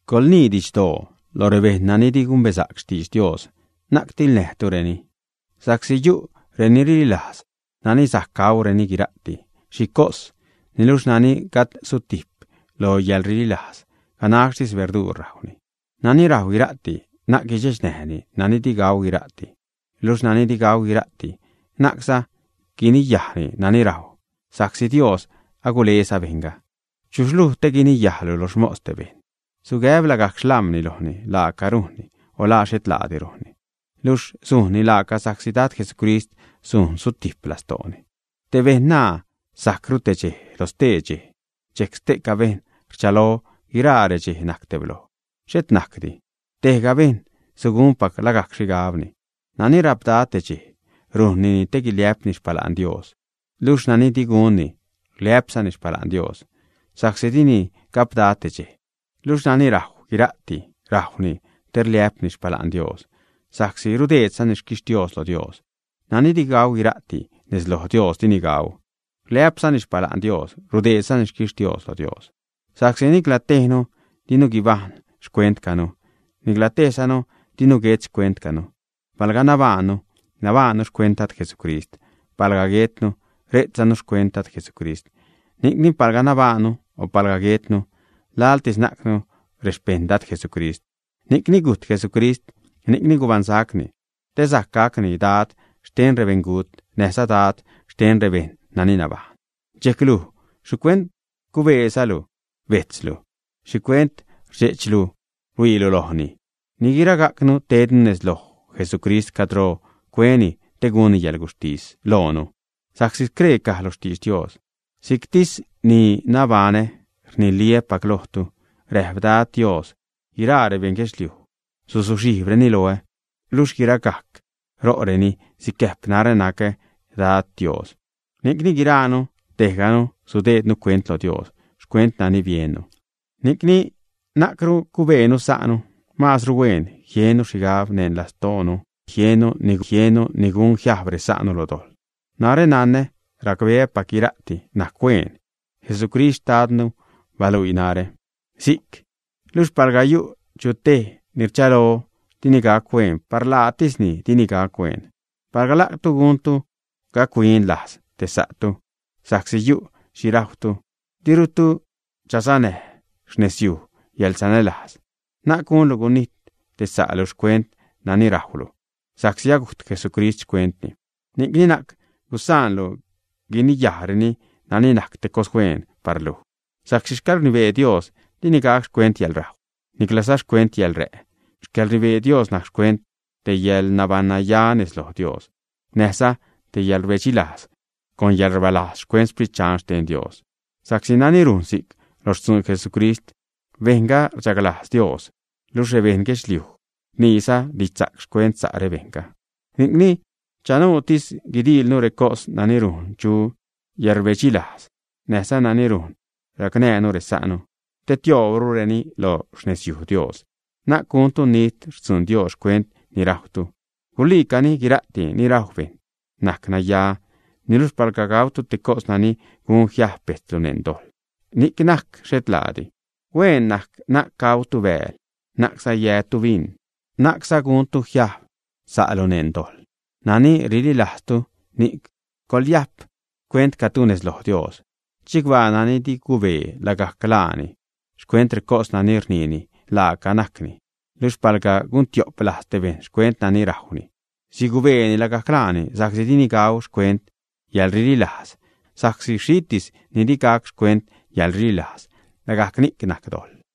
Coḻnii didxdoo lo rebejṉ nani di gumbesa'c xtidx Dios, na'c tiḻnäjtureni. Sa'csi yu' reni rililajz nani sajc gaureni guira'ti xhi cos, niluxh nani gajd sutijp lo yäḻrililajz, ganaxtis berduur rajwni. Nani rajw guira'ti, na'c guidxechnäjni nani di gau guira'ti; luxh nani di gau guira'ti, na'cza guiniyajni nani rajw sa'csi Dios aguleza bejṉga. ¿Chuxh luj te guiniyajlu lo xmos te bejṉ, ä? Sugäb lagajc xlam̲ni lojni la laaca rujnni o la xhet laadi rujnni. Luxh sujnni laaca sa'csi Dad Jesucrist sujn sutijp lastooni. Tej bejṉ naa sajcru tej dxej lo stee dxej, dxejc ste'ca bejṉ rchalo guiraa redxej najc tebloj. Xhet najcdi, tejga bejṉ sugunpac lagajc xhigabni. Nani rapda te dxej, rujnnini te guiliä'pni xpala'n Dios, luxh nani di gunni, rliä'pzani xpala'n Dios sa'csi dini gapda te dxej. Luxh nani rajw guira'ti, rajwni te rliä'pni xpala'n Dios, sa'csi rudeedzani xquixtios lo Dios; nani di gau guira'ti, nez lo Dios dini gau, rliä'pzani xpala'n Dios, rudeedzani xquixtios lo Dios. Sa'csi nicla tejnu dinu guibajṉ xcuentcanu, nicla tejzanu dinu guet xcuentcanu. Palga nabaannu, nabaannu xcuent Dad Jesucrist; palga guetnu, rejtzanu xcuent Dad, Jesucrist. Ni'cni palga nabaannu, o palga guetnu, laḻtis najcnu rexpeṉ Dad, Jesucrist. Ni'cni gujt Jesucrist, ni'cni gubaṉsaczani, te sajc gacni Dad xten rebeṉgut, näjza Dad xten rebejṉ nani nabajṉ. Dxejc luj, ¿xhicuent cubeelu bejtzlu, ä? O ¿xhicuent rdxe'chlu rhuiilu lojni, ä? Ni guiragajcnu tednu nez loj Jesucrist cadro cueni te gunni yäḻguxhtis loonu. Sa'csi scree caj lo xtidx Dios: Si'ctis ni nabaṉä, rniliä́pac lojtu, räjp Dad Dios, guiraa rebeṉ guedxliuj suzuxhijbreni loä, luxh guiragajc ro'reni sicäjp narä nacä Dad Dios. Ni'cni guiraanu, tejganu sudeednu cuent loj Dios xcuent nani biennu. Ni'cni na'cru cubeenu sa'nu. Maazru hueen jiennu xhigab neṉ lastoonu xhetliidi jiennu ni gun jiajb resa'nu lo dojḻ. Narä nanä, racbeäpac guira'ti najc hueen. Jesucrist Xtadnu baluii narä si'c. Luxh palga yu' chu tej ni rchalo dini gac hueen, par laatisni dini gac hueen. Palga la'tu guntu gac-huin lajz te sa'tu sa'csi yu' xhi rajwtu, dirutu chasanäj xnezyuj yäḻsanälajz. Na'c gunlu gunijt te sa'lu xcuent nani rajwlu, sa'csi agujt Jesucrist xcuentni. Ni'cni na'c gusaanlu guiniyajreni nani najc te cos hueen par luj. Sa'csi xcäḻrnibee Dios dini gac xcuent yäḻrajw, niclaza xcuent yäḻrä'; xcäḻrnibee Dios najc xcuent te yäḻnabaṉnya nez loj Dios, näjza yäḻrbedxilajz con yäḻrbalajz xcuent Sprit Dxan xten Dios. Sa'csi nani rujn si'c lo xtzuun Jesucrist, bejṉga rchaglajz Dios, luxh rebeṉ guedxliuj rniiza didxsa'c xcuent sa' bejṉga. Ni'cni chanuutis guidiilnu recos nani rujn chu yäḻrbedxilajz, näjza nani rujn racnäjnu resa'nu te tioobrureni loj xnezyuj Dios. Na'c guntu nit xtzuun Dios xcuent ni rajwtu. Guliicani guira'ti ni rajw bejṉ najc naya, niluxh palga gautu te cos nani gun jiajb bejtzlu neṉ dojḻ, ni'c najc xhet laadi. Hueen najc na'c gautu bääl, na'cza yätu bin, na'cza guntu jiajb sa'lu neṉ dojḻ. Nani rililajztu, ni'c coḻyajp xcuentcatu nez loj Dios. Chicbaa nani di cubee lagajc laani xcuent recos nani rniini laaca najcni. Luxh palga guntio'p lajz te bejṉ xcuent nani rajwni, sigubeeni lagajc laani, sa'csi dini gau xcuent yäḻrililajz, sa'csi xhitis ni di gac xcuent yäḻrililajz, lagajc ni'c najc dojḻ.